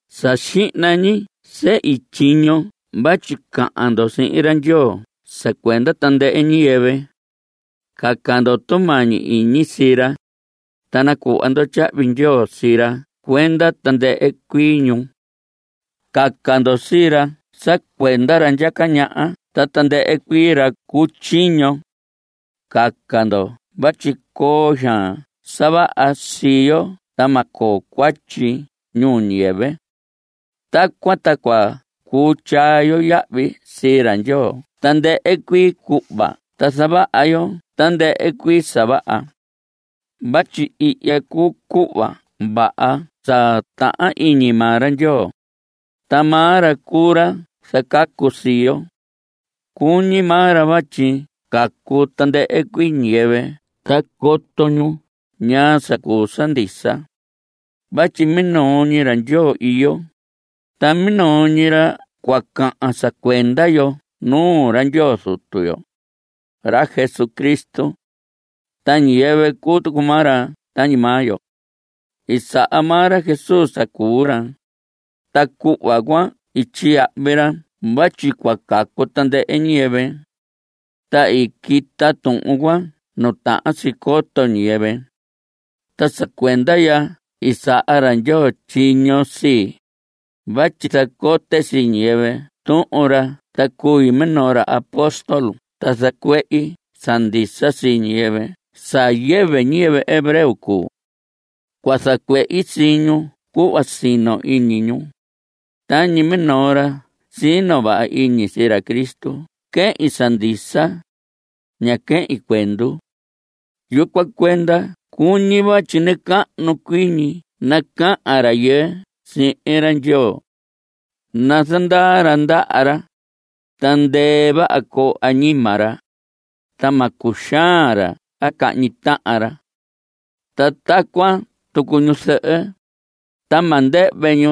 Sa xihna ñi sehi tyiño vatyi cahan ndo sihin ra Ndyoo sa cuenda tandɨhɨ ñiyɨvɨ. Caca ndo tumañi iñi sii ra, ta nacuhva ndo tyahvi ndyoo sii ra cuenda tandɨhɨ cuii ñu. Caca ndo sii ra sa cuenda ra ndyaca ñaha ta tandɨhɨ cuii ra cu tyiño. Caca ndo vatyi coo xaan sa vaha sii yo ta ma coo cuatyi ñuu ñiyɨvɨ. Tacuan ta cua cuu tyaa yo yahvi sii ra Ndyoo tandɨhɨ cuii cuhva ta zavaha yo tandɨhɨ cuii sa vaha. Vatyi ihya cuu cuhva vaha sa tahan iñi maa ra Ndyoo, ta maa ra cuu ra zacacu sii yo. Cuñi maa ra vatyi cacu tandɨhɨ cuii ñiyɨvɨ ta coto ñu ñaa sa cuu sa ndisa. Vatyi minoo ñi ra Ndyoo iyo, ta minoo ñi ra cua cahan sa cuenda yo nuu ra Ndyoo Zutu yo, ra Jesucristo. Ta ñiyɨvɨ cuu tucu maa ra tañi maa yo. I saha maa ra Jesús sa cuu ra, ta cuhva cuan i tyiyahvi ra vatyi cuu cacu tandɨhɨ ñiyɨvɨ. Ta i quita tuhun cuan nu tahan si coto ñiyɨvɨ. Ta sa cuenda ya i saha ra Ndyoo tyiño sii, vatyi zacote sii ñiyɨvɨ tuhun ra ta cui minoo ra apóstol ta zacuehi sa ndisa sii ñiyɨvɨ sa yɨvɨ ñiyɨvɨ hebreo cuu. Cua zacuehi sii ñu cuhva sino iñi ñu. Tañi minoo ra sino vaha iñi sii ra Cristo quehin sa ndisa. Ña quehin cuendu. Yucuan cuenda cuñi vatyi nacahnu cuii ñi nacahan rayɨɨ sihin ra Ndyoo. Nazandaa ra ndaha ra. Ta ndɨɨ vaha coo añima ra. Ta ma cuxaan ra a cahñi tahan ra. Ta tacuan tucu ñuzɨhɨ. Ta ma ndɨhvɨ ñu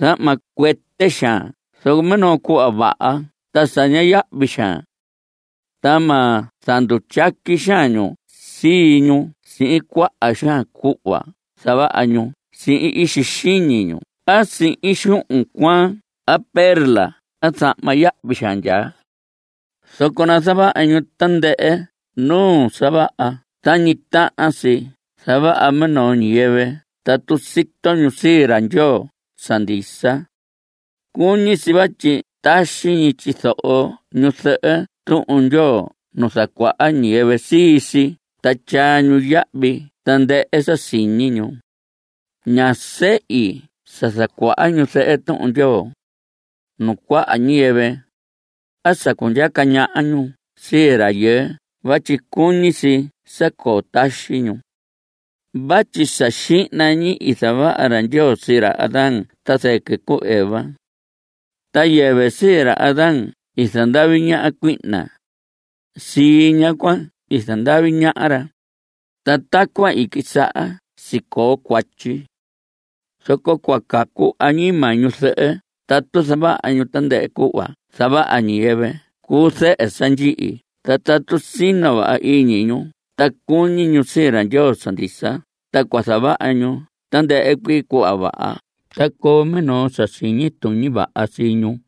zahma cuɨtɨ xaan zoco minoo cuhva vaha ta sa ña yahvi xaan. Ta ma zandutyaqui xaan ñu sii ñu sihin cuaha xaan cuhva zavaha ñu sihin ixi xiñi ñu a sihin xuhun cuaan a perla a zahma yahvi xaan. Zoco nazavaha ñu tandɨhɨ nuu sa vaha tañi tahan si zavaha minoo ñiyɨvɨ tatu sito ñu sii ra Ndyoo sa ndisa. Cuñi si vatyi taxi ñi tyizoho ñuzɨhɨ Tuhun Ndyoo nu zacuaha ñiyɨvɨ sii si ta tyaa ñu yahvi tandɨhɨ sa siñi ñu. Ña sehi sa zacuaha ñuzɨhɨ Tuhun Ndyoo (nuu cuaha ñiyɨvɨ) a sa cundyaca ñaha ñu sii rayɨɨ vatyi cuñi si sa coo taxi ñu. Vatyi sa xihna ñi i zavaha ra Ndyoo sii ra Adán ta zɨquɨ cu Eva. Ta yɨvɨ sii ra Adán i zandavi ñaha cuihna. Sii ñaha cuan i zandavi ñaha ra, ta tacuan i quisaha sicoo cuatyi. Zoco cua cacu añima ñuzɨhɨ tatu zavaha ñu tandɨhɨ cuhva zavaha ñiyɨvɨ cuu zɨhɨ sa ndyihi ta tatu sino vaha iñi ñu ta cuñi ñu sii ra Ndyoo sa ndisa ta zavaha ñu tandɨhɨ cuii cuhva vaha ta coo minoo sa siñi tuñi vaha sii ñu.